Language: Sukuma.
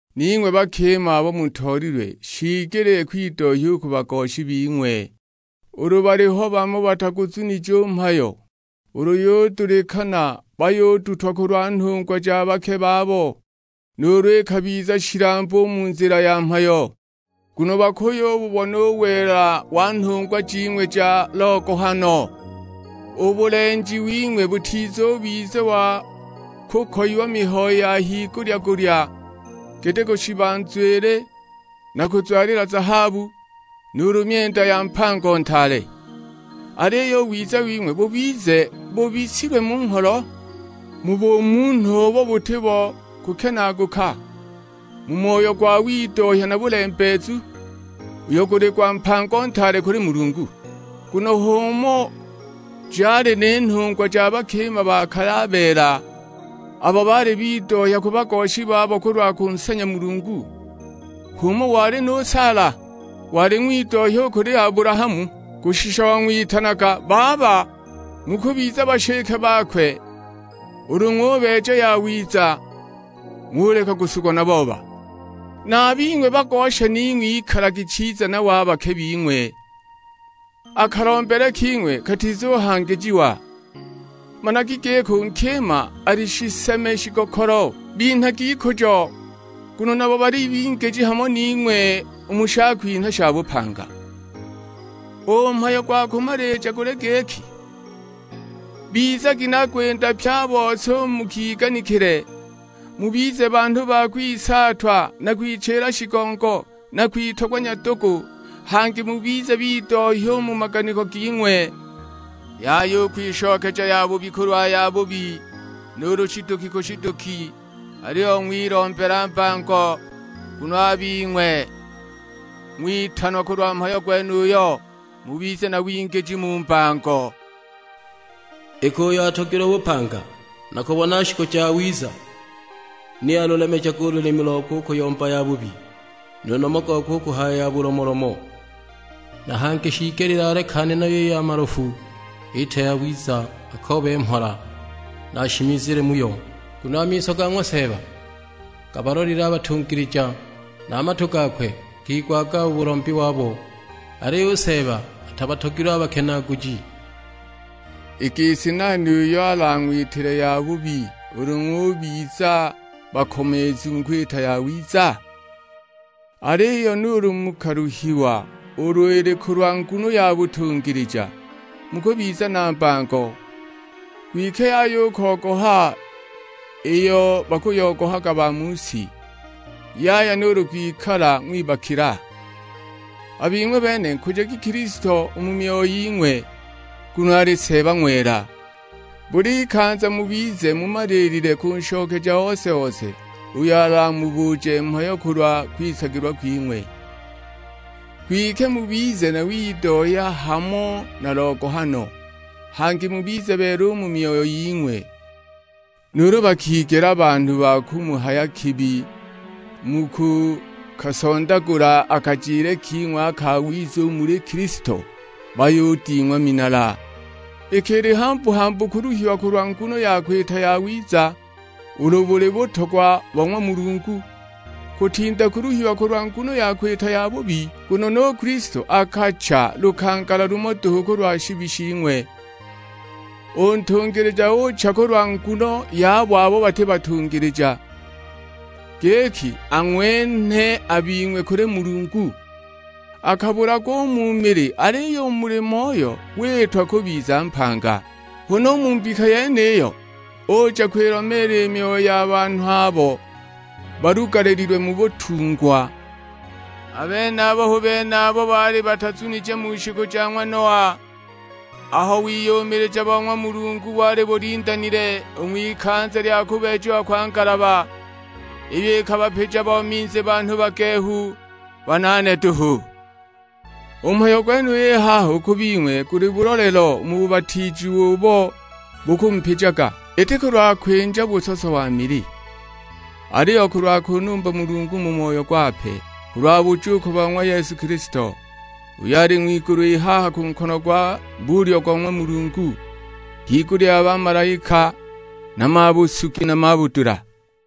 Ning'we a bakima abo mutoolilwe shiigelile kwidohya u ku bagoshi bing'we, ulu baliho bamo bataguzunije u mhayo, ulu yudulikana bayudutwa kulwa nhungwa ja bake babo, nuulu ikabiza shilambu u mu nzila ya mhayo. Nguno bakuyububona u wela wa nhungwa jing'we ja logohano. U bulenji wing'we butizubiza wa kukoyiwa mihayo ya higulya-gulya giti kushiba nzwili na kuzwalila zahabu, nuulu myenda ya mpango ntaale. Aliyo u wiza wing'we bubize bubisilwe mu ngholo, mu bumunhu ubo buti bo kukenaaguka, mu moyo gwa widohya na bulembeezu, uyo guli gwa mpango ntaale kuli Mulungu. Nguno h'umo jali ni nhungwa ja bakima ba kale a beela, abo baali bidohya ku bagoshi babo kulwa kunsanya Mulungu. H'umo wali nu Saala; wali ng'widohya u kuli Abulahamu, kushisha wang'witanaga, baba! Mukubiza bashike bakwe ulu ng'ubeeja yawiza, ng'uleka kusugwa na booba. Na a bing'we bagosha ning'we ikalagi chiza nabo a bake bing'we, a kalombele king'we katizuhangijiwa; managi giki u nkima ali shiseme shigokolo. Binhagi ikujo, nguno nabo bali bingiji hamo ning'we u mu shakwinhwa sha bupanga. U mhayo gwa kumalija guli giki, bizagi na gwinda pye a bose u mu kiganikile, mubize banhu ba kwisaatwa na kwichila shigongo, na kwitogwa nyadugu; hangi mubize bidohya u mu maganiko ging'we. Yaya u kwishokeja yabubi kulwa yabubi, nuulu shiduki ku shiduki, aliyo ng'wilombela mbango, nguno a bing'we ng'witanwa kulwa mhayo gwenuyo, mubize na wingiji mu mbango. "Iki uyo atogilwe bupanga na kubona shiku jawiza, ni alulemejage u lulimi lokwe u kuyomba yabubi, nu nomo gokwe u kuhaya ya bulomolomo. Na hangi shiigelile alekane nayo i ya malofu; iite yawiza, akoobe mhola, na ashimizile muyo. Nguno a miso ga ng'wa Seeba gabalolile a batungilija, na a matu gakwe gakigwaga u bulombi wabo. Aliyo u Seeba atabatogilwe a bakenaaguji." I gisi nani uyo alang'witile yabubi ulu ng'ubiza bakomeezu mu kwita yawiza? Aliyo nuulu mukaluhiwa ulu ili kulwa nguno ya butungilija, mukubiza na mbango; kwike yaya u kogoha iyo bakuyogohaga ba mu si, yaya nuulu kwikala ng'wibakila. A bing'we bene nkujagi Kilisto u mu myoyo ying'we, nguno ali Seeba ng'wela. Bul'ikanza mubize mumaliilile kunshokeja ose-ose uyo alamubuje mhayo kulwa kwisagilwa kwing'we. Kwike mubize na widohya hamo na logohano, hangi mubize beela u mu myoyo ying'we; nuulu bakigela banhu ba kumuhaya kibi mu kukasondagula a kajile king'we a kawiza u muli Kilisto, bayuding'wa minala. Iki ili hambu-hambu kuluhiwa kulwa nguno ya kwita yawiza ulu buli butogwa bo ng'wa Mulungu, kutinda kuluhiwa kulwa nguno ya kwita yabubi. Nguno nu Kilisto akacha lukangala lumo duhu kulwa shibi shing'we; u Ntungilija ucha kulwa nguno yabo abo bati batungilija, giki ang'wenhe a bing'we kuli Mulungu. Akabulagwa u mu mili aliyo u muli Moyo witwa kubiza mpanga. Huna u mu mbika yeniyo, uja kwilomeela i myoyo ya banhu abo balugalililwe mu butungwa. A benabo hu bene abo baali batazunije mu shiku ja ng'wa Noa, aho wiyumilija bo ng'wa Mulungu wali bulindanile u ng'wikanza lya kubeejiwa kwa ngalaba, iyo ikabapija bo minzi banhu bagehu, banaane duhu. U mhayo gwenuyu i haha u ku bing'we guli bulolelo u mu bubatiijiwa ubo bukumupijaga, iti kulwa kwinja busoso wa mili, aliyo kulwa kunumba Mulungu mu moyo gwape; kulwa bujuuko bo ng'wa Yesu Kilisto, uyo ali ng'wigulu i haha ku nkono gwa bulyo go ng'wa Mulungu, higulya ya bamalaika na mabusugi na mabudula.